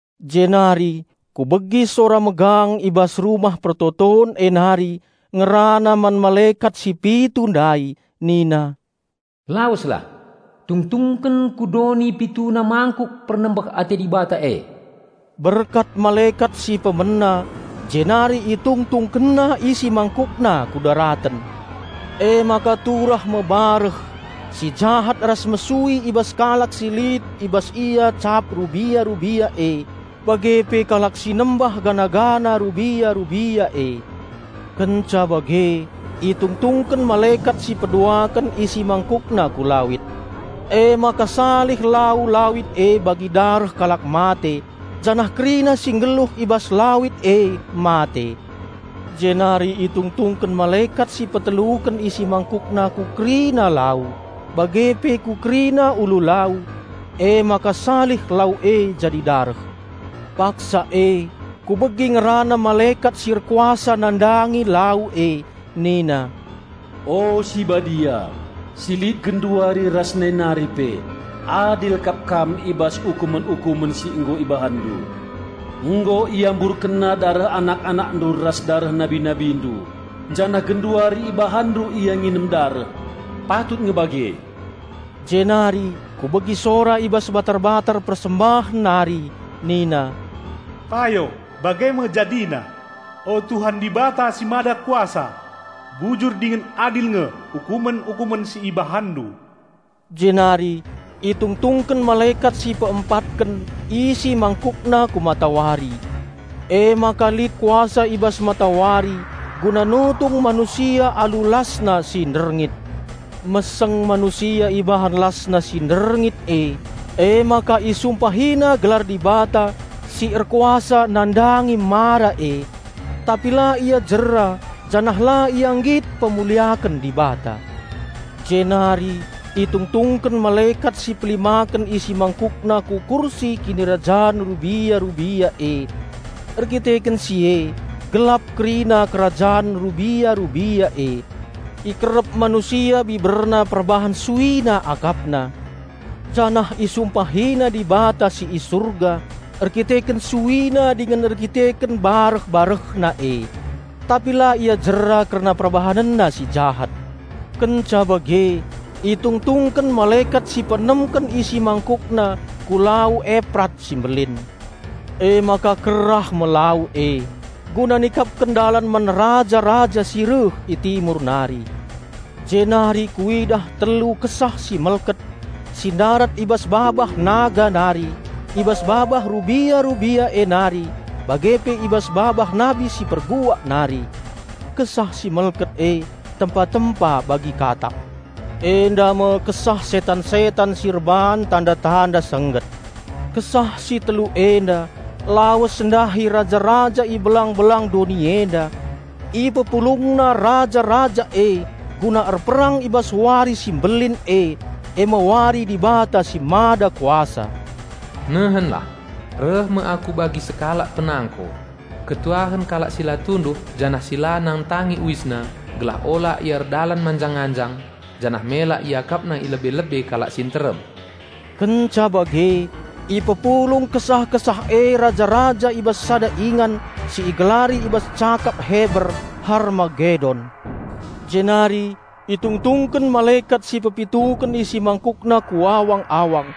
Jenari kubegi sora megang i bas Rumah Pertoton e nari ngerana man malekat si pitu ndai nina, "Laweslah, tungtungken ku doni pituna mangkuk pernembeh ate Dibata e!" Berkat malekat si pemena jenari itungtungkenna isi mangkukna ku daraten. Emaka turah me bareh si jahat ras mesui i bas kalak si lit i bas ia cap rubia-rubia e, bage pe kalak si nembah patung rubia-rubia e. Kenca bage itungtungken malekat si peduaken isi mangkukna ku lawit. Emaka salih lau lawit e bagi dareh kalak mate, janah kerina si nggeluh i bas lawit e mate. Jenari itungtungken malekat si peteluken isi mangkukna ku kerina lau bage pe ku kerina ulu lau. Emaka salih lau e jadi dareh. Paksa e kubegi ngerana malekat si erkuasa nandangi lau e nina, "O si Badia, si lit genduari ras nai nari pe, adil kap Kam i bas ukumen-ukumen si nggo IbahanNdu! Nggo iamburkenna dareh anak-AnakNdu ras dareh nabi-NabiNdu, janah genduari IbahanNdu ia nginem dareh. Patut nge bage!" Jenari kubegi sora i bas batar-batar persembahen nari nina, "Payo, bage me jadina. O Tuhan, Dibata si Mada Kuasa! Bujur dingen adil nge ukumen-ukumen si IbahanNdu!" Jenari itungtungken malekat si peempatken isi mangkukna ku matawari. Emaka lit kuasa i bas matawari guna nutung manusia alu lasna si nderngit. Meseng manusia ibahan lasna si nderngit e, emaka isumpahina gelar Dibata, si erkuasa nandangi mara e. Tapi la ia jera janah la ia nggit mpermuliaken Dibata. Jenari itungtungken malekat si pelimaken isi mangkukna ku kursi kinirajan rubia-rubia e. Erdandanken si e gelap kerina kerajan rubia-rubia e. Ikerep manusia biberna perbahan suina akapna, janah isumpahina Dibata si i Surga erdandanken suina dingen erdandanken bareh-barehna e. Tapi la ia jera kerna perbahanenna si jahat. Kenca bage itungtungken malekat si peenemken isi mangkukna ku Lau Eprat si mbelin. Emaka kerah me lau e, guna nikapken dalan man raja-raja si reh i Timur nari. Jenari kuidah telu kesah si melket, si ndarat i bas babah naga nari, i bas babah rubia-rubia e nari, bage pe i bas babah nabi si palsu nari. Kesah si melket e tempa-tempa bagi katak. Enda me kesah setan-setan si erbahan tanda-tanda sengget. Kesah si telu enda lawes ndahi raja-raja i belang-belang doni enda; ipepulungna raja-raja e guna erperang i bas wari si mbelin e, e me wari Dibata si Mada Kuasa! "Nehenlah! Reh me Aku bagi sekalak penangko! Malem me ate kalak si la tunduh janah si la nangtangi uisna, gelah ola ia erdalan manjang-anjang, janah mela iakapna i lebe-lebe kalak si nterem!" Kenca bage ipepulung kesah-kesah e raja-raja i bas sada ingan si igelari i bas cakap Heber, Harmagedon. Jenari itungtungken malekat si pepituken isi mangkukna ku awang-awang.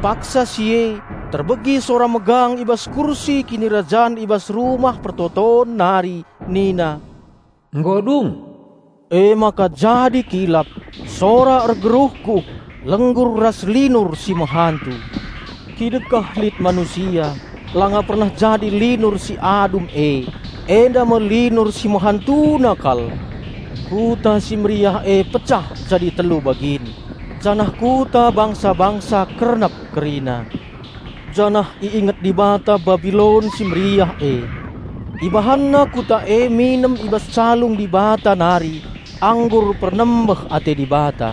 Paksa si e terbegi sora megang i bas kursi kinirajan i bas Rumah Pertoton nari nina, "Nggo dung!" Emaka jadi kilap, sora ergeruhguh, lenggur ras linur si mehantu. Kidekah lit manusia langa pernah jadi linur si adum e. Enda me linur si mehantuna kal! Kuta si meriah e pecah jadi telu bagin, janah kuta bangsa-bangsa kernep kerina. Janah iinget Dibata Babilon si meriah e. IbahanNa kuta e nginem i bas calung Dibata nari anggur pernembeh ate Dibata.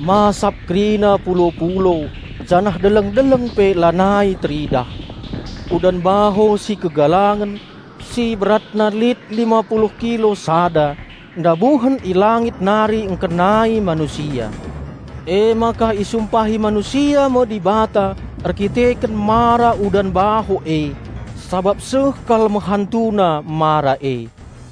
Masap kerina pulo-pulo janah deleng-deleng pe lanai teridah. Udan baho si kegalangen, si beratna lit lima puluh kilo sada, ndabuhen i langit nari ngkenai manusia. Emaka isumpahi manusia me Dibata erkiteken mara udan baho e, sabap seh kal mehantuna mara e.